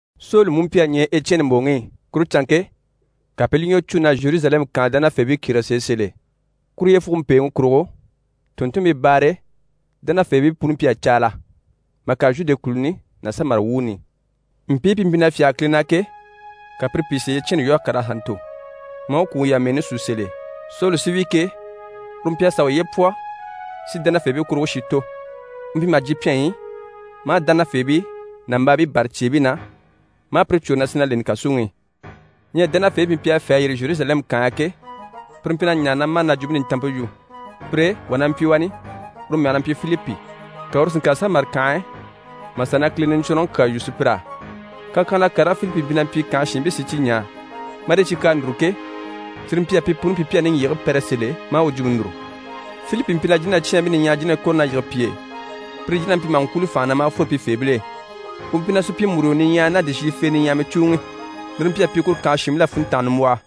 Soli mú mpyi a ɲɛɛ Ecyɛni mbòŋi i. Kuru canŋke, ka pi i li ɲwɔ cû na Zheruzalɛmu kànhe dánafeebii kyérege sèe sèl'e. Kuru yyefuge mpèeŋi kurugo, tùnntunmpii baare e, dánafeebii puni mpyi a caala mà kàre Zhude kùluni ná Samari wuuni i. Mpii pi mpyi na fyáge Kile na ke, ka pire pìi si Ecyɛni lwɔ́ a kàr'a sà ntò, maa u kwùŋi yamɛɛni sú sèl'e. Soli sí wi ke, uru mpyi a sàa uye pwɔ si dánafeebii kuruŋke shi tò. U mpyi maha jyè pyɛnyi i, maa dánafeebii, nàmbaabii bâra cyeebii na, maa pire cwôre na sì na leni kàsuŋi i. Ɲyɛ dánafeebii pi mpyi a fê a yîri Zheruzalɛmu kànhe e ke, pire mpyi na ɲaare na mâre na Jwumpe Nintanmpe yu. Pire e, wà na mpyi wani, uru mɛge na mpyi Filipi, ka uru si ŋkàre Samari kànhe e mà sà na Kile Niɲcwɔnrɔŋi kyaa yu sùpyir'á. Kakyanhala karigii Filipi mpyi na mpyi kànhe shiinbii sí i cyi ɲaa marii cyi kyaa núru ke, cyire mpyi a pi puni pyi pi a niŋgyigigii pɛrɛ sèl'e maa u jwumpe núru. Filipi mpyi na jínacyaanbii niɲyahamii jínahii kɔ̀re na yige pi e. Pire jínabii mpyi maha ŋkwúuli fànha na maa fwore pifeebil'e. U mpyi na supyimuruyo niɲyahaya ná dìshiyifee niɲyahamii cùuŋi. Lire mpyi a pyi kuru kànhe shiinbil'á funntanga nimbwɔhɔ.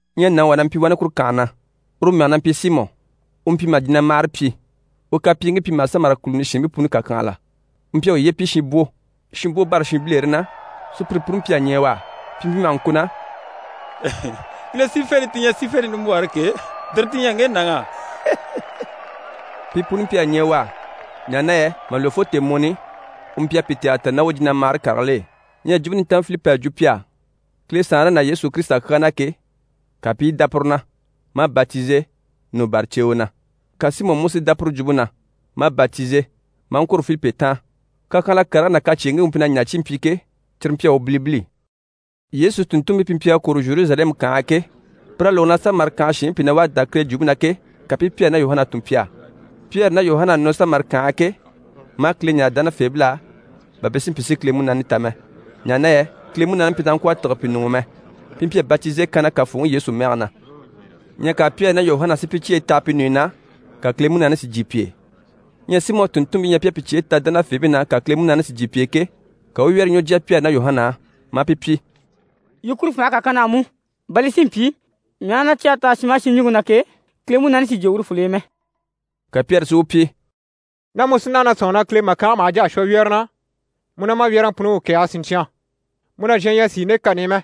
Ɲyɛ nàŋi wà na mpyi wani kuru kànhe na, uru mɛge na mpyi Simɔ. U mpyi maha jinamahare pyi, u kapyiiŋkii mpyi maha Samari kùluni shiinbii puni kàkyanhala. U mpyi a uye pyi shinbwo. Shinbwo bâra shinbilere na, sùpyire puni mpyi a ɲɛɛ u á. Pi mpyi maha ŋko na: «Kile sífente ti ɲyɛ sífente nimbwɔɔre ke, tire ti ɲyɛ ŋge nàŋ'á.» Pi puni mpyi a ɲɛɛ u á, ɲaha na yɛ mà lwɔ́ fo tèemɔni i, u mpyi a pi tɛgɛlɛ ta ná u jinamahare karigil'e. Ɲyɛ Jwumpe Nintanmpe Filipi à jwo pi á Kile Saanre ná Yesu Kirisita kyaa na ke, ka pi i dá puru na, maa batize, nɔ bâra ceewe na. Ka Simɔ mú si dá puru jwumpe na, maa batize, maa ŋkwôro Filipi taan. Kakyanhala karigii ná kacyeeŋkii u mpyi na ɲaa cyi i mpyi ke, cyire mpyi a u bilibili. Yesu tùnntunmpii pi mpyi a kwôro Zheruzalɛmu kànhe e ke, pir'à lógo na Samari kànhe shiinbii pìi na wá a dá Kile jwumpe na ke, ka pi i Pyɛri ná Yuhana tun pi á. Pyɛri ná Yuhana à nɔ Samari kànhe e ke, maa Kile ɲáare dánafeebil'á, bà pi si mpyi si Kile Munaani ta mɛ. Ɲaha na yɛ Kile Munaani mpyi na sàha ŋkwɔ̀ a tîge pi ɲuŋ'i mɛ, pi mpyi a batize kanna Kafooŋi Yesu mɛge na. Ɲyɛ ka Pyɛri ná Yuhana si pi cyeyi taha pi ɲùɲyi na, ka Kile Munaani si jyè pi e. Ɲyɛ Simɔ à tùnntunmpii ɲya pi à pi cyeyi taha dánafeebii na, ka Kile Munaani si jyè pi e ke, ka u u wyɛ́rɛ ɲwɔ jya Pyɛri ná Yuhana á, maa pi pyi: «Yii kuru fànhe kà kan na á mú, bà li si mpyi mii aha na cyɛge taha shin maha shin ɲùŋke na ke, Kile Munaani si jyè urufol'e mɛ.» Ka Pyɛri si u pyi: «Ná mu sí naha na sɔ̂nŋi na Kile màkange maha jà a shwɔ wyɛ́rɛŋi na, mu ná ma wyɛ́rɛŋi puni u kɛ̀ɛge siɲcyan. Mu nàzhan ɲyɛ a sìi nde kani i mɛ,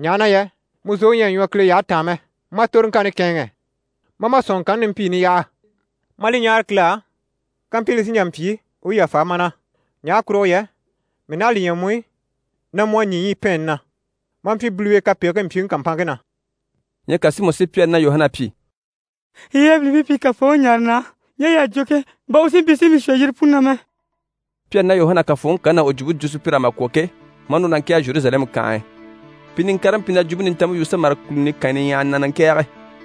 ɲaha na yɛ mu zòŋi ɲyɛ a ɲwɔ Kile yyahe taan mɛ. Ma toroŋkanni kɛ̂ɛnŋɛ, ma a ma sɔ̀nŋɔŋkanni nimpiini yaha, ma a li ɲáare Kile á, kampyi li sí n‑jà n‑pyi, u u li yàfa ma na. Ɲaha kurugo yɛ mii naha a li ɲya mu i, na mu a ɲî ɲyipɛɛnni na, maa mpyi biliwe kapegigii mpyiŋi kàmpanŋke na.» Ɲyɛ ka Simɔ si Pyɛri ná Yuhana pyi: «Yii yabilimpii pi Kafooŋi ɲáare na á, ɲje yii à jwo ke, bà u si mpyi si mii shwɔ yire puni na mɛ.» Pyɛri ná Yuhana à Kafooŋi kani ná u jwumpe jwo sùpyir'á mà kwɔ̀ ke, maa núru na ŋkɛ̀ɛge Zheruzalɛmu kànhe e. Pi niŋkaribii mpyi na Jwumpe Nintanmpe yu Samari kùluni kànyi niɲyahaya na, na ŋkɛ̀ɛge.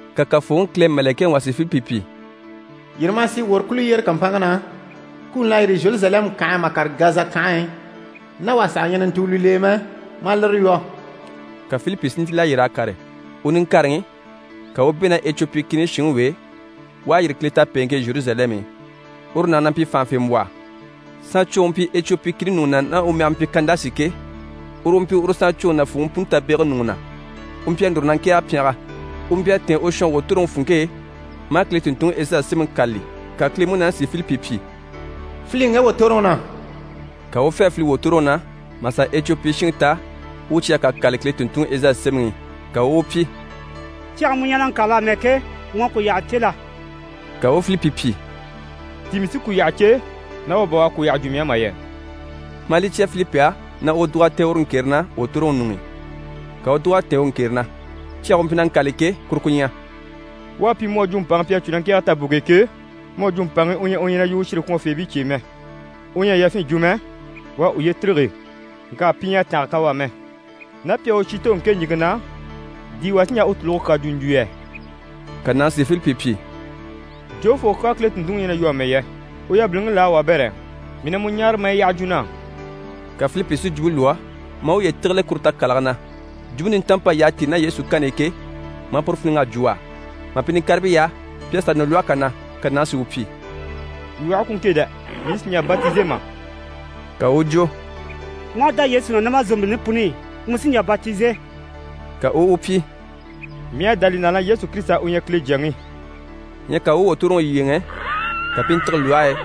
Ka Kafooŋi Kile mɛ̀lɛkɛŋi wà si Filipi pyi: «Yîri maa sì wòro kùl'e yyére kàmpanŋke na. Kuni l'à yîri Zheruzalɛmu kànhe e mà kàre Gaza kànhe e, ná wà saha ɲyɛ na ntùuli l'e mɛ, ma a lire lwɔ́.» Ka Filipi si ntíl'a yîr'a kàre. U niŋkareŋi, ka u u bɛ̂ ná Ecwopi kìni shinŋi w'e, u à yîri Kile tapeeŋke e Zheruzalɛmu i. Uru nàŋi na mpyi fànhafembwɔhɔ. Saancwoŋi u mpyi Ecwopi kìni ɲùŋɔ na, ná u mɛge mpyi Kandasi ke, uru u mpyi uru saancwoŋi nàfuuŋi puni tabegege ɲùŋɔ na. U mpyi a núru na ŋkɛ̀ɛge pyɛngɛ. U mpyi a tɛ̀ɛn u shɔnge wòtoroŋi funŋke e maa Kile tùnntunŋi Ezayi Semɛŋi kâlali. Ka Kile Munaani si Filipi pyi: «File ŋge wòtoroŋi na.» Ka u u fê a file wòtoroŋi na, mà sà Ecwopi shinŋi ta u u cyage kà kâlali Kile tùnntunŋi Ezayi sémɛŋi i. Ka u u u pyi: «Cyage mu ɲyɛ na ŋkâlali amɛ ke, mu à ku yyaha cè la?» Ka u u Filipi pyi: «Di mii sí ku yyaha cè, ná wà bà u a ku yyaha jwo mii á mà yɛ?» Maa li cya Filipi á na u dùg'a tɛ̀ɛn uru ŋkere na wòtoroŋi ɲuŋ'i. Ka u u dùg'a tɛ̀ɛn u ŋkere na. Cyage u mpyi na ŋkâlali ke, kuru ku ɲyɛ: «U à pyi mu à jwo mpàŋi pi à cû na ŋkɛ̀ɛge taboŋke e ke, mu à jwo mpàŋi u ɲyɛ u ɲyɛ na yu u shire kwɔnfeebii cye e mɛ. U ɲyɛ a yafyin jwo mɛ. U à uye tîrige, ŋka pi ɲyɛ a tànga kan u á mɛ. Ná pi à u shi tò ŋke ɲìŋke na, di wà sí n‑jà u tùluge kyaa jwo n‑jwo yɛ?» Ka nàŋi si Filipi pyi: «Jofoo kyaa Kile tùnntunŋi ɲyɛ na yu amɛ yɛ? U yabiliŋi laa, wabɛrɛ? Mii na mu ɲáare, ma a yi yyaha jwo na á.» Ka Filipi si jwumpe lwɔ́, maa uye tígile kuru takalage na, Jwumpe Nintanmpe p'à yyaha tíi ná Yesu i ke, maa puru fíniŋ'a jwo u á. Mà pi niŋkaribii yaha, pi à sà nɔ lwɔhe kà na, ka nàŋi si u pyi: «Lwɔhe ku ŋke dɛ, mii sì n‑jà batize mà?» [ Ka u u jwo: «Mu aha dá Yesu na ná ma zòmbilini puni i, mu sí n‑jà batize.» Ka u u u pyi: «Mii à dá li na na Yesu Kirisita u ɲyɛ Kile Jyaŋi.»] Ɲyɛ ka u u wòtoroŋi yyéeŋɛ, ka pi i ntîge lwɔhe e,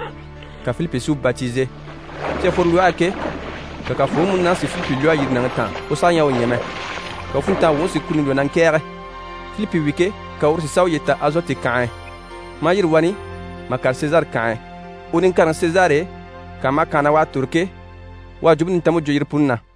ka Filipi si u batize. Pi à fworo lwɔhe e ke, ka Kafooŋi Kile Munaani si Filipi lwɔ́ a yîri nàŋi taan, u saha ɲyɛ a u ɲya mɛ, ka u funntanga wuŋi si kuni lwɔ́ na ŋkɛ̀ɛge. Filipi wi ke, ka uru si sà uye ta Azoti kànhe e, maa yîri wani mà kàre Sezare kànhe e. U niŋkareŋi Sezare e, kànha maha kànha na u à tòro ke, u à Jwumpe Nintanmpe jwo yire puni na.